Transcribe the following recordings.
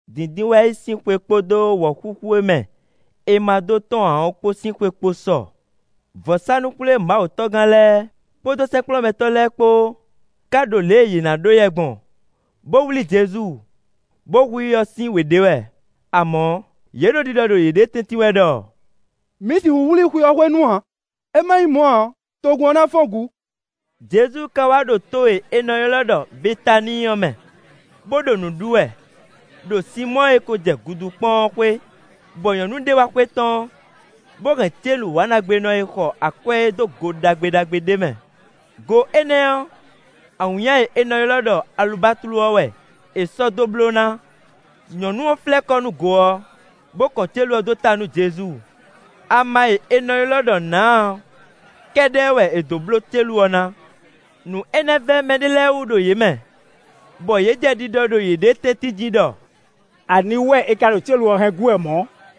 Dǐndínwáyi sín xwe kpódó wɔ̌xúxú e mɛ è ma dó tɔ́n ǎ ɔ́ kpó sín xwe kpo sɔ. Vɔ̌sánú-xwlémawutɔ́gán lɛ́ɛ kpódó sɛ́nkplɔ́nmɛtɔ́ lɛ́ɛ kpó ká ɖo lě e yě ná ɖó yɛ gbɔn, bó wlí Jezu, bó hu i ɔ́ sín wě ɖe wɛ. Amɔ̌, yě ɖo ɖiɖɔ ɖo yěɖée tɛ́ntin wɛ ɖɔ: “Mǐ sixú wlí i xwe ɔ́ hwenu ǎ; é má nyí mɔ̌ ǎ ɔ́, togun ɔ́ ná fɔ́n gǔ.” Jezu ka wá ɖo to e è nɔ ylɔ́ ɖɔ Betaníi ɔ́ mɛ, bó ɖo nǔ ɖu wɛ, ɖo Sinmɔ́ɔ e ko jɛ gudu kpɔ́n ɔ́ xwé, bɔ nyɔ̌nu ɖé wá xwetɔ́n, bó hɛn célu wǎnɖagbenɔ e xɔ akwɛ́ é dó go ɖagbe ɖagbe ɖé mɛ; go énɛ́ ɔ́, awǐnnya e è nɔ ylɔ́ ɖɔ alubatlu ɔ́ wɛ è sɔ́ dó bló ná. Nyɔ̌nu ɔ́ flɛ́ kɔ nú go ɔ́, bó kɔn célu ɔ́ dó ta nú Jezu; ama e è nɔ ylɔ́ ɖɔ nǎa ɔ́ kɛ́ɖɛ́ wɛ è dó bló célu ɔ́ ná. Nǔ énɛ́ vɛ́ mɛɖé lɛ́ɛ wú ɖo yě mɛ, bɔ yě jɛ ɖiɖɔ ɖo yěɖée tɛ́ntin jí ɖɔ: “Aniwú wɛ é ka ɖo célu ɔ́ hɛn gú wɛ mɔ̌?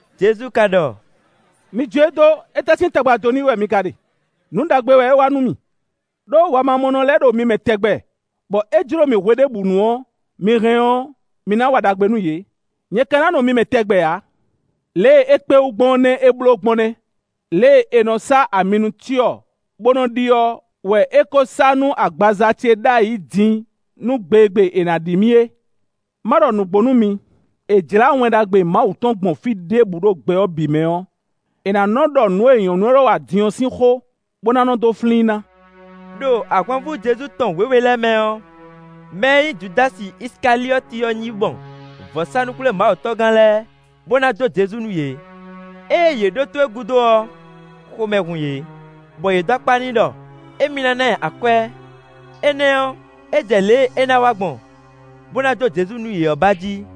Jezu ka ɖɔ: “Mi jó e dó; étɛ́ sín tagba dó n'i wɛ mi ka ɖe? Nǔ ɖagbe wɛ é wa nú mì. Đó wamamɔnɔ lɛ́ɛ ɖo mi mɛ tɛgbɛ, bɔ é jló mi hweɖěbǔnu ɔ́, mi hɛn ɔ́, mi ná wa ɖagbe nú yě. Nyɛ ka ná nɔ mi mɛ tɛgbɛ ǎ. Lě e é kpé wú gbɔn ɔ́ nɛ́ é bló gbɔn nɛ́; lě e è nɔ sá ami nú cyɔ bó nɔ ɖi ɔ́ wɛ é ko sá nú agbaza ce ɖ'ayǐ din nú gbe e gbe è nǎ ɖi mì é. Má ɖɔ nǔgbó nú mi: è jlǎ Wɛn Ɖagbe Mawu tɔn gbɔn fí ɖěbǔ ɖo gbɛ ɔ́ bǐ mɛ ɔ́, è nǎ nɔ́ ɖɔ nǔ e nyɔ̌nu élɔ́ wa din ɔ́ sín xó, bó ná nɔ́ dó flín i ná.” Đo ahwanvú Jezu tɔn wěwe lɛ́ɛ mɛ ɔ́, mɛ e nyí Judási Isikaliɔ́ti ɔ́ yi mɔ vɔ̌sánú-xwlémawutɔ́gán lɛ́ɛ, bó ná jó Jezu nú yě. Ée yě ɖótó e gúdo ɔ́, xomɛ hun yě, bɔ yě dó akpá n'i ɖɔ émí ná ná ɛ akwɛ́; énɛ́ ɔ́, é jɛ lě e é ná wa gbɔn, bó ná jó Jezu nú yě ɔ́ ba jí.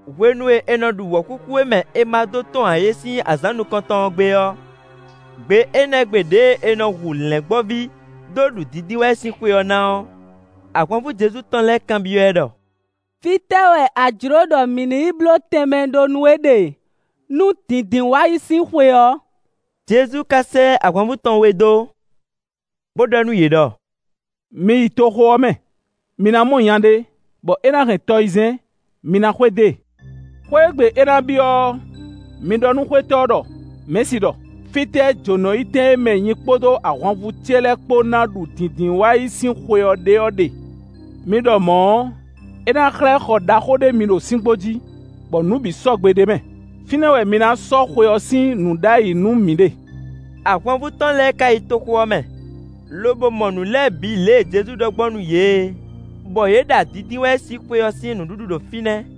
Hwenu e è nɔ ɖu wɔ̌xúxú e mɛ è ma dó tɔ́n ǎ é sín azǎn nukɔntɔn ɔ́ gbe ɔ́, gbe énɛ́ gbe ɖěe è nɔ hu lɛ̌ngbɔ́ví dó ɖu Dǐndínwáyi sín xwe ɔ́ ná ɔ́, ahwanvú Jezu tɔn lɛ́ɛ kanbyɔ́ ɛ ɖɔ: “Fítɛ́ wɛ a jlǒ ɖɔ mǐ ní yi bló tɛnmɛ ɖó nú we ɖe nú Dǐndínwáyi sín xwe ɔ́?” Jezu ka sɛ́ ahwanvú tɔn we dó, bó ɖɔ nú yě ɖɔ: “Mi yi toxo ɔ́ mɛ; mi ná mɔ nya ɖé, bɔ é ná hɛn tɔyizɛ́n. Mi ná xwedó e. Xwé e gbe é ná byɔ́ ɔ́, mi ɖɔ nú xwétɔ́ ɔ́ ɖɔ: ‘Mɛ̌si ɖɔ: Fítɛ́ jǒnɔyítɛn e mɛ nyi kpódó ahwanvú ce lɛ́ɛ kpó ná ɖu Dǐndínwáyi sín xwe ɔ́ ɖe ɔ́ ɖe?’ Mi ɖɔ mɔ̌ ɔ́, é ná xlɛ́ xɔ ɖaxó ɖé mi ɖo síngbó jí, bɔ nǔ bǐ sɔgbe ɖ'é mɛ; fínɛ́ wɛ mi ná sɔ́ xwe ɔ́ sín nǔ ɖ'ayǐ nú mǐ ɖe.” Ahwanvú tɔn lɛ́ɛ ka yi toxo ɔ́ mɛ, lobo mɔ nǔ lɛ́ɛ bǐ lě e Jezu ɖɔ gbɔn nú yě é, bɔ yě ɖa Dǐndínwáyi sín xwe ɔ́ sín nǔɖuɖu ɖo fínɛ́.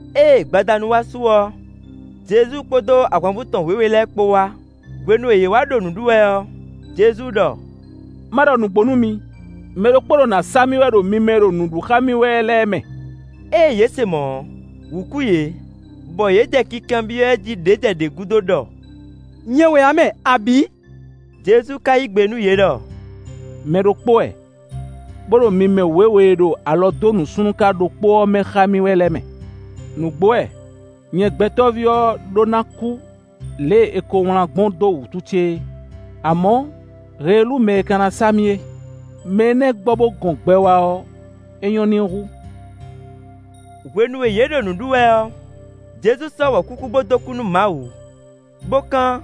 Ée gbadanu wá su ɔ́, Jezu kpódó ahwanvú tɔn wěwe lɛ́ɛ kpó wá. Hwenu e yě wá ɖo nǔ ɖu wɛ ɔ́, Jezu ɖɔ: “Má ɖɔ nǔgbó nú mi, mɛ ɖokpó ɖo nǎ sa mì wɛ ɖo mi mɛ e ɖo nǔ ɖu xá mì wɛ lɛ́ɛ mɛ.” Ée yě se mɔ̌ ɔ́, wǔ kú yě, bɔ yě jɛ kinkanbyɔ́ ɛ jí ɖě jɛ ɖě gúdo ɖɔ: “Nyɛ wɛ ǎ mɛ, abǐ?” Jezu ka yí gbe nú yě ɖɔ: “Mɛ ɖokpó wɛ, bó ɖo mi mɛ wěwe e ɖo alɔ dó nǔsúnnúká ɖokpó ɔ́ mɛ xá mì wɛ lɛ́ɛ mɛ. Nǔgbó wɛ, nyɛ Gbɛtɔ́ví ɔ́ ɖó ná kú lě e è ko wlán gbɔn dó wǔtu ce é; amɔ̌ heelú mɛ e ka ná sa mì é; mɛ énɛ́ gbɔ bó gɔn gbɛ wá ɔ́, é nyɔ́ n'i hú.” Hwenu e yě ɖo nǔ ɖu wɛ ɔ́, Jezu sɔ́ wɔ̌xúxú bó dó kú nú Mawu, bó kán,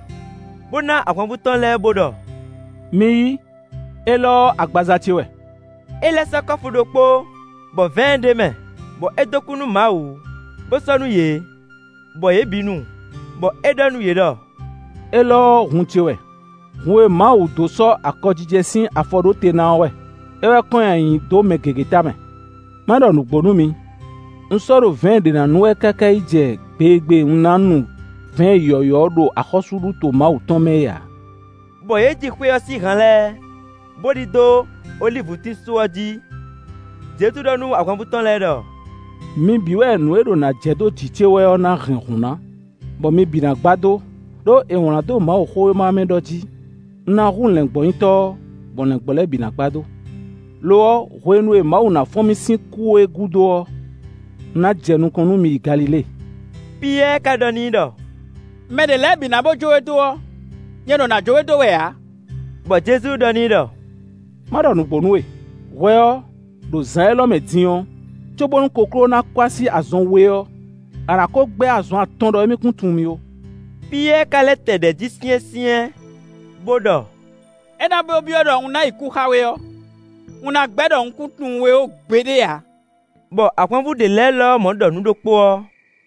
bó ná ahwanvú tɔn lɛ́ɛ bó ɖɔ: “Mi yí, élɔ́ ɔ́ agbaza ce wɛ.” É lɛ́ sɔ́ kɔ́fu ɖokpó, bɔ vɛ̌ɛn ɖ'é mɛ, bɔ é dó kú nú Mawu, bó sɔ́ nú yě, bɔ yě bǐ nu. Bɔ é ɖɔ nú yě ɖɔ: “Élɔ́ ɔ́ hun ce wɛ; hun e Mawu dó sɔ́ akɔjijɛ sín afɔ ɖó te ná ɔ́ wɛ; é wɛ kɔn nyi ayǐ dó mɛ gěgé tamɛ. Má ɖɔ xó nǔgbó nú mi: un sɔ́ ɖo vɛ̌ɛn ɖě ná nu wɛ káká yi jɛ gbe e gbe un ná nu vɛ̌ɛn yɔ̌yɔ́ ɔ́ ɖo axɔ́súɖuto Mawu tɔn mɛ é ǎ.” Bɔ yě ji xwe ɔ́ sín han lɛ́ɛ, bó ɖidó olívutín só ɔ́ jí. Jezu ɖɔ nú ahwanvú tɔn lɛ́ɛ ɖɔ: “Mi bǐ wɛ nǔ e ɖo nǎ jɛ dó jǐ ce wɛ ɔ́ ná hɛn hǔn ná, bɔ mi bǐ ná gbadó; ɖó è wlǎn dó Mawuxówéma ɔ́ mɛ ɖɔ jí: ‘Un ná hu lɛ̌ngbɔ́nyitɔ́ ɔ́, bɔ lɛ̌ngbɔ́ lɛ́ɛ bǐ ná gbadó.’ Lo ɔ́, hwenu e Mawu ná fɔ́n mì sín kú é gúdo ɔ́, un ná jɛ nukɔn nú mi yi Galilée.” Piyɛ́ɛ ka ɖɔ n'i ɖɔ: “Mɛ ɖě lɛ́ɛ bǐ na bó jó we dó ɔ́, nyɛ ɖo nǎ jó we dó wɛ ǎ.” Bɔ Jezu ɖɔ n'i ɖɔ: “Má ɖɔ nǔgbó nú we: hwɛ ɔ́, ɖo zǎn élɔ́ mɛ din ɔ́, cóbónú kokló ná kɔ́ así azɔn we ɔ́, a nǎ kó gbɛ́ azɔn atɔn ɖɔ émí kún tunwun mì ó.” Piyɛ́ɛ ka lɛ́ tɛ ɖɛ̌ jí syɛ́nsyɛ́n, bó ɖɔ: “É ná bó byɔ́ ɖɔ un ná yi kú xá we ɔ́, un ná gbɛ́ ɖɔ un kún tunwun we ó gbeɖé ǎ.” Bɔ ahwanvú ɖě lɛ́ɛ lɔmɔ̌ ɖɔ nǔ ɖokpó ɔ́.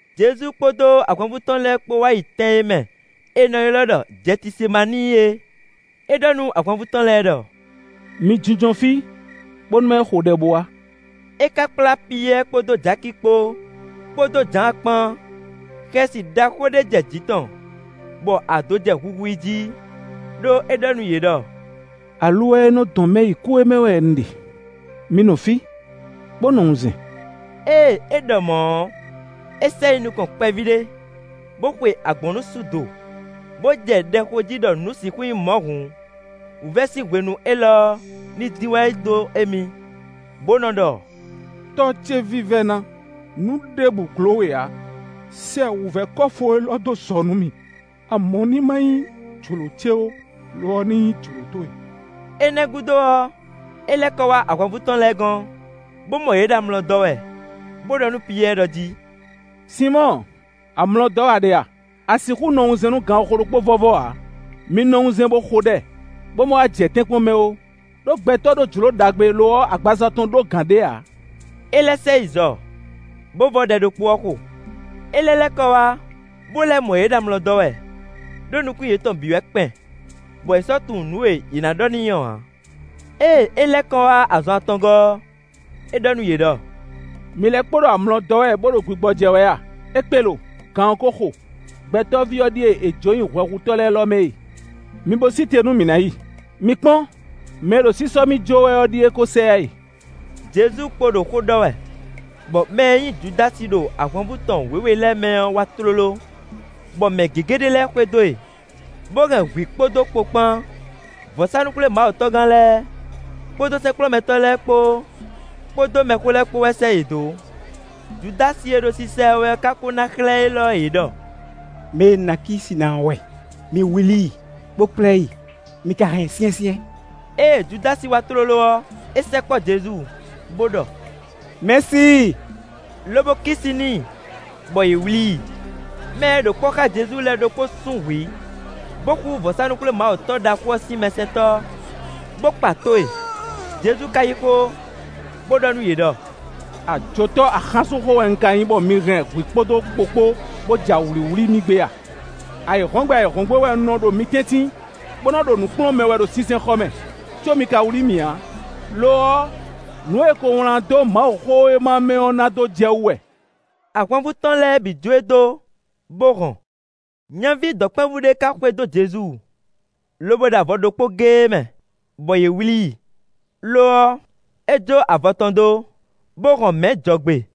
Jezu kpódó ahwanvú tɔn lɛ́ɛ kpó wá yi tɛn e mɛ è nɔ ylɔ́ ɖɔ Jɛtisemaníi é. É ɖɔ nú ahwanvú tɔn lɛ́ɛ ɖɔ: “Mi jínjɔ́n fí, bónú má yi xo ɖɛ bó wá.” É ka kplá Piyɛ́ɛ kpódó Jaki kpó, kpódó Jǎan kpán. Xɛsi ɖaxó ɖé jɛ jǐ tɔn, bɔ ado jɛ huhu i jí. Đó é ɖɔ nú yě ɖɔ: “Aluwɛ e nɔ dɔn mɛ yi kú é mɛ wɛ un ɖe; mi nɔ fí, bó nɔ wunzɛn.” Ée é ɖɔ mɔ̌ ɔ́, é sɛ yi nukɔn kpɛví ɖé, bó xwe agbɔ̌nnusú do, bó jɛ ɖɛ xo jí ɖɔ nǔ sixú nyí mɔ̌ hǔn, wǔvɛ́ sín hwenu élɔ́ ɔ́ ní dín wá yi dó émí. Bó nɔ́ ɖɔ: “Tɔ́ ce vívɛ́ná, nǔ ɖěbǔ gló we ǎ; sɛ wǔvɛ́ kɔ́fu élɔ́ dó zɔ nú mì; amɔ̌ ní má nyí jlǒ ce ó, lo ɔ́, ní nyí jlǒ towe.” Énɛ́ gúdo ɔ́, é lɛ́ kɔ wá ahwanvú tɔn lɛ́ɛ gɔ́n, bó mɔ yě ɖo amlɔ dɔ́ wɛ, bó ɖɔ nú Piyɛ́ɛ ɖɔ jí: “Sinmɔ́ɔ, amlɔ dɔ́ wɛ a ɖe a? A sixú nɔ wunzɛn nú ganxixo ɖokpó vɔ́vɔ́ ǎ? Mi nɔ wunzɛn bó xo ɖɛ, bó má wá jɛ tɛ́nkpɔ́n mɛ ó, ɖó gbɛtɔ́ ɖó jlǒ ɖagbe, lo ɔ́, agbaza tɔn ɖó gǎn ɖé ǎ.” É lɛ́ sɛ yi zɔ, bó vɔ́ ɖɛ ɖokpó ɔ́ xo. É lɛ́ lɛ́ kɔ wá, bó lɛ́ mɔ yě ɖo amlɔ dɔ́ wɛ, ɖó nukún yětɔn bǐ wɛ kpɛn, bɔ yě sɔ́ tunwun nǔ e yě ná ɖɔ n'i ɔ́ ǎ. Ée é lɛ́ kɔ wá azɔn atɔngɔ́ ɔ́, é ɖɔ nú yě ɖɔ: “Mi lɛ́ kpo ɖo amlɔ dɔ́ wɛ, bó ɖo gbigbɔ́jɛ́ wɛ a? É kpé lo; gan ɔ́ kó xo. Gbɛtɔ́ví ɔ́ ɖíe è jǒ nyi hwɛhutɔ́ lɛ́ɛ lɔ mɛ e. Mi bo sí te nú mǐ ná yi. Mi kpɔ́n! Mɛ e ɖo sísɔ́ mì jó wɛ ɔ́ ɖíe kó sɛ yá e.” Jezu kpo ɖo xó ɖɔ wɛ, bɔ mɛ e nyí Judási ɖo ahwanvú tɔn wěwe lɛ́ɛ mɛ ɔ́ wá tlóló, bɔ mɛ gěgé ɖé lɛ́ɛ xwedó e, bó hɛn hwǐ kpódó kpo kpán. Vɔ̌sánú-xwlémawutɔ́gán lɛ́ɛ, kpódó sɛ́nkplɔ́nmɛtɔ́ lɛ́ɛ kpó, kpódó mɛxó lɛ́ɛ kpó wɛ sɛ́ yě dó. Judási e ɖo sisa ɛ wɛ ɔ́ ka kó ná xlɛ́ élɔ́ yě ɖɔ: “Mɛ e un ná kí si ná ɔ́ wɛ, mi wlí i, bó kplá ɛ yi, mi ka hɛn ɛ syɛ́nsyɛ́n.” Ée Judási wá tlóló ɔ́, é sɛkpɔ́ Jezu, bó ɖɔ: “Mɛ̌si”, lobo kí si n'i. Bɔ yě wlí i. Mɛ e ɖo kpɔ́ xá Jezu lɛ́ɛ ɖokpó sún hwǐ, bó xú vɔ̌sánú-xwlémawutɔ́ ɖaxó ɔ́ sín mɛsɛntɔ́, bó kpa tó e. Jezu ka yí xó, bó ɖɔ nú yě ɖɔ: “Ajotɔ́ axánsúnxó wɛ un ka nyí bɔ mi hɛn hwǐ kpódó kpo kpó bó ja wlǐwlí mì gbé a? Ayǐhɔ́ngbe ayǐhɔ́ngbe wɛ un nɔ ɖo mi tɛ́ntin, bó nɔ́ ɖo nǔ kplɔ́n mɛ wɛ ɖo sinsɛnxɔ mɛ, có mi ka wlí mì ǎ. Lo ɔ́, nǔ e è ko wlán dó Mawuxówéma mɛ ɔ́ ná dó jɛ wú wɛ.” Ahwanvú tɔn lɛ́ɛ bǐ jó e dó, bó hɔn. Nyaví dɔ̌nkpɛvú ɖé ká xwedó Jezu, lobo ɖo avɔ ɖokpó géé mɛ, bɔ yě wlí i. Lo ɔ́, é jó avɔ tɔn dó, bó hɔn mɛ̌ jɔgbe.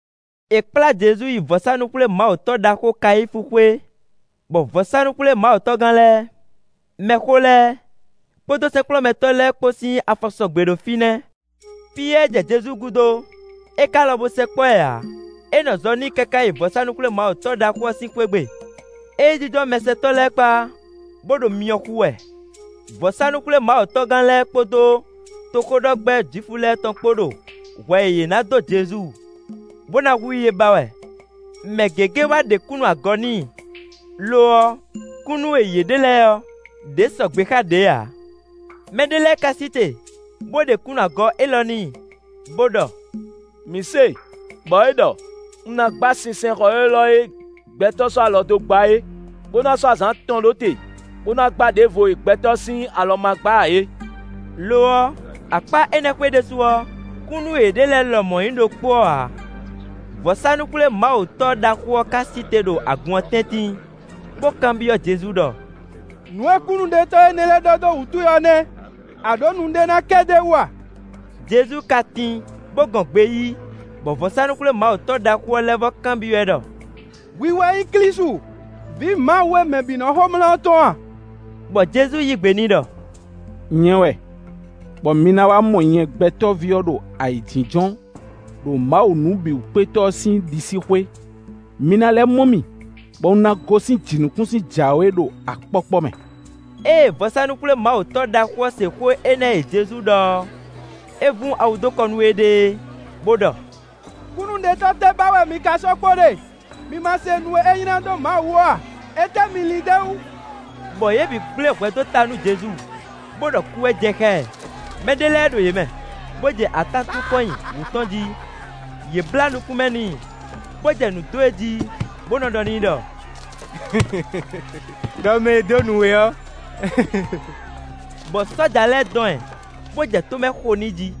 È kplá Jezu yi vɔ̌sánú-xwlémawutɔ́ ɖaxó Kayífu xwé, bɔ vɔ̌sánú-xwlémawutɔ́gán lɛ́ɛ, mɛxó lɛ́ɛ, kpódó sɛ́nkplɔ́nmɛtɔ́ lɛ́ɛ kpó sín afɔ sɔgbe ɖo fínɛ́. Piyɛ́ɛ jɛ Jezu gúdo; é ká lɔn bó sɛkpɔ́ ɛ ǎ; é nɔ zɔ n'i káká yi vɔ̌sánú-xwlémawutɔ́ ɖaxó ɔ́ sín xwé gbe. É yi jínjɔ́n mɛsɛntɔ́ lɛ́ɛ kpá, bó ɖo myɔ xú wɛ. Vɔ̌sánú-xwlémawutɔ́gán lɛ́ɛ kpódó toxóɖɔgbɛ́ Jwifu lɛ́ɛ tɔn kpó ɖo hwɛ e yě ná dó Jezu, bó ná hu i é ba wɛ. Mɛ gěgé wá ɖe kúnnu agɔ n'i; lo ɔ́, kúnnu e yě ɖe lɛ́ɛ ɔ́, ɖě sɔgbe xá ɖě ǎ. Mɛ ɖé lɛ́ɛ ká sí te, bó ɖe kúnnu agɔ élɔ́ n'i, bó ɖɔ: “Mǐ se, bɔ é ɖɔ: ‘Un ná gba sinsɛnxɔ élɔ́ e gbɛtɔ́ sɔ́ alɔ dó gbá é, bó ná sɔ́ azǎn atɔn ɖó te, bó ná gbá ɖěvo e gbɛtɔ́ sín alɔ ma gbá ǎ é.’” Lo ɔ́, akpá énɛ́ xwé ɖésú ɔ́, kúnnu e yě ɖe lɛ́ɛ lɔmɔ̌ nyí ɖokpó ɔ́ ǎ. Vɔ̌sánú-xwlémawutɔ́ ɖaxó ɔ́ ká sí te ɖo agun ɔ́ tɛ́ntin, bó kanbyɔ́ Jezu ɖɔ: “Nǔ e kúnnuɖetɔ́ énɛ́ lɛ́ɛ ɖɔ dó wǔ towe ɔ́ nɛ́, a ɖǒ nu ɖé ná kɛ d'é wú a?” Jezu ka tin, bó gɔn gbe yí, bɔ vɔ̌sánú-xwlémawutɔ́ ɖaxó ɔ́ lɛ́ vɔ́ kanbyɔ́ ɛ ɖɔ: “Hwi wɛ nyí Klísu, vǐ Mawu e mɛ bǐ nɔ́ xomlá ɔ́ tɔn a?” Bɔ Jezu yí gbe n'i ɖɔ: “Nyɛ wɛ, bɔ mi ná wá mɔ nyɛ Gbɛtɔ́ví ɔ́ ɖo ayǐjínjɔ́n ɖo Mawu Nǔbǐwúkpétɔ́ ɔ́ sín ɖisíxwé; mi ná lɛ́ mɔ mì, bɔ un ná gosín jǐnukúnsin jǎwe ɖo akpɔ́kpɔ́ mɛ.” Ée vɔ̌sánú-xwlémawutɔ́ ɖaxó ɔ́ se xó énɛ́ e Jezu ɖɔ ɔ́, é vún awu dó kɔ nú éɖée, bó ɖɔ: “Kúnnuɖiɖe tɛ́ ba wɛ mi ka sɔ́ kpo ɖe? Mi ma se nu e é nylá dó Mawu wú ɔ́ a? Étɛ́ mi lin d'é wú?” Bɔ yě bǐ gblé hwɛ dó ta nú Jezu, bó ɖɔ kú wɛ jɛ xá ɛ. Mɛ ɖé lɛ́ɛ ɖo yě mɛ, bó jɛ atán tún kɔn nyi wú tɔn jí; yě blǎ nukún mɛ n'i, bo jɛ nǔ dó e jí, bo nɔ ɖɔ n'i ɖɔ: “Đɔ mɛ e dó nǔ we ɔ́.” Bɔ sɔ́ja lɛ́ɛ dɔn ɛ, bo jɛ tó mɛ xo n'i jí.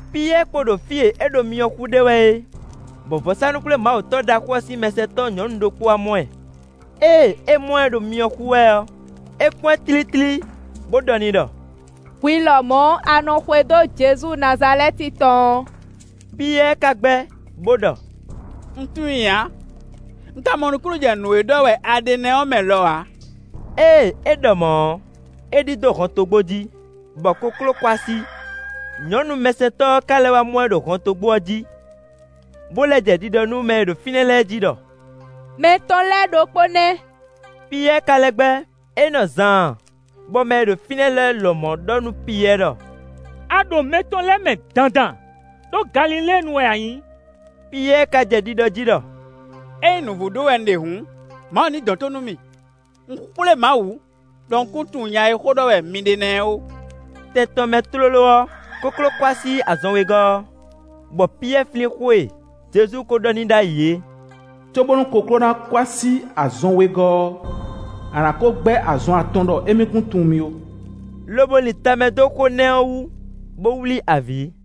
Piyɛ́ɛ kpo ɖo fí e é ɖo myɔ xú ɖe wɛ é, bɔ vɔ̌sánú-xwlémawutɔ́ ɖaxó ɔ́ sín mɛsɛntɔ́ nyɔ̌nu ɖokpó wá mɔ ɛ. Ée é mɔ ɛ ɖo myɔ xú wɛ ɔ́, é kpɔ́n ɛ tlítlí, bó ɖɔ n'i ɖɔ: “Hwi lɔmɔ̌ a nɔ xwedó Jezu Nazalɛ́ti tɔn ɔ́.” Piyɛ́ɛ ka gbɛ́, bo ɖɔ: “Un tunwun i ǎ, un ka mɔ nukúnnú jɛ nǔ e ɖɔ wɛ a ɖe nɛ́ ɔ́ mɛ lɔ ǎ;” ée é ɖɔ mɔ̌ ɔ́, é ɖidó hɔntogbó jí, bɔ kokló kɔ́ así. Nyɔ̌nu mɛsɛntɔ́ ɔ́ ka lɛ́ wá mɔ ɛ ɖo hɔntogbó ɔ́ jí, bo lɛ́ jɛ ɖiɖɔ nú mɛ e ɖo fínɛ́ lɛ́ɛ jí ɖɔ: “Mɛ tɔn lɛ́ɛ ɖokpó nɛ́.” Piyɛ́ɛ ka lɛ́ gbɛ́. É nɔ zaan, bɔ mɛ e ɖo fínɛ́ lɛ́ɛ lɔmɔ̌ ɖɔ nú Piyɛ́ɛ ɖɔ: “A ɖo mɛ tɔn lɛ́ɛ mɛ dandan; ɖó Galiléenu wɛ a nyǐ.” Piyɛ́ɛ ka jɛ ɖiɖɔ jí ɖɔ: “Ényí nǔvú ɖó wɛ un ɖe hǔn, Mawu ní dɔn tó nú mì. Un xwlé Mawu ɖɔ un kún tunwun nya e xó ɖɔ wɛ mi ɖe nɛ́ ɔ́ ó.” Tɛn tɔn mɛ tlóló ɔ́, kokló kɔ́ así azɔn wegɔ́ ɔ́, bɔ Piyɛ́ɛ flín xó e Jezu ko ɖɔ n'i ɖ'ayǐ é: “Cóbónú kokló ná kɔ́ así azɔn wegɔ́ ɔ́, a nǎ kó gbɛ́ azɔn atɔn ɖɔ émí kún tunwun mì ó,” lobo lin tamɛ dó xó nɛ́ ɔ́ wú, bó wlí avǐ.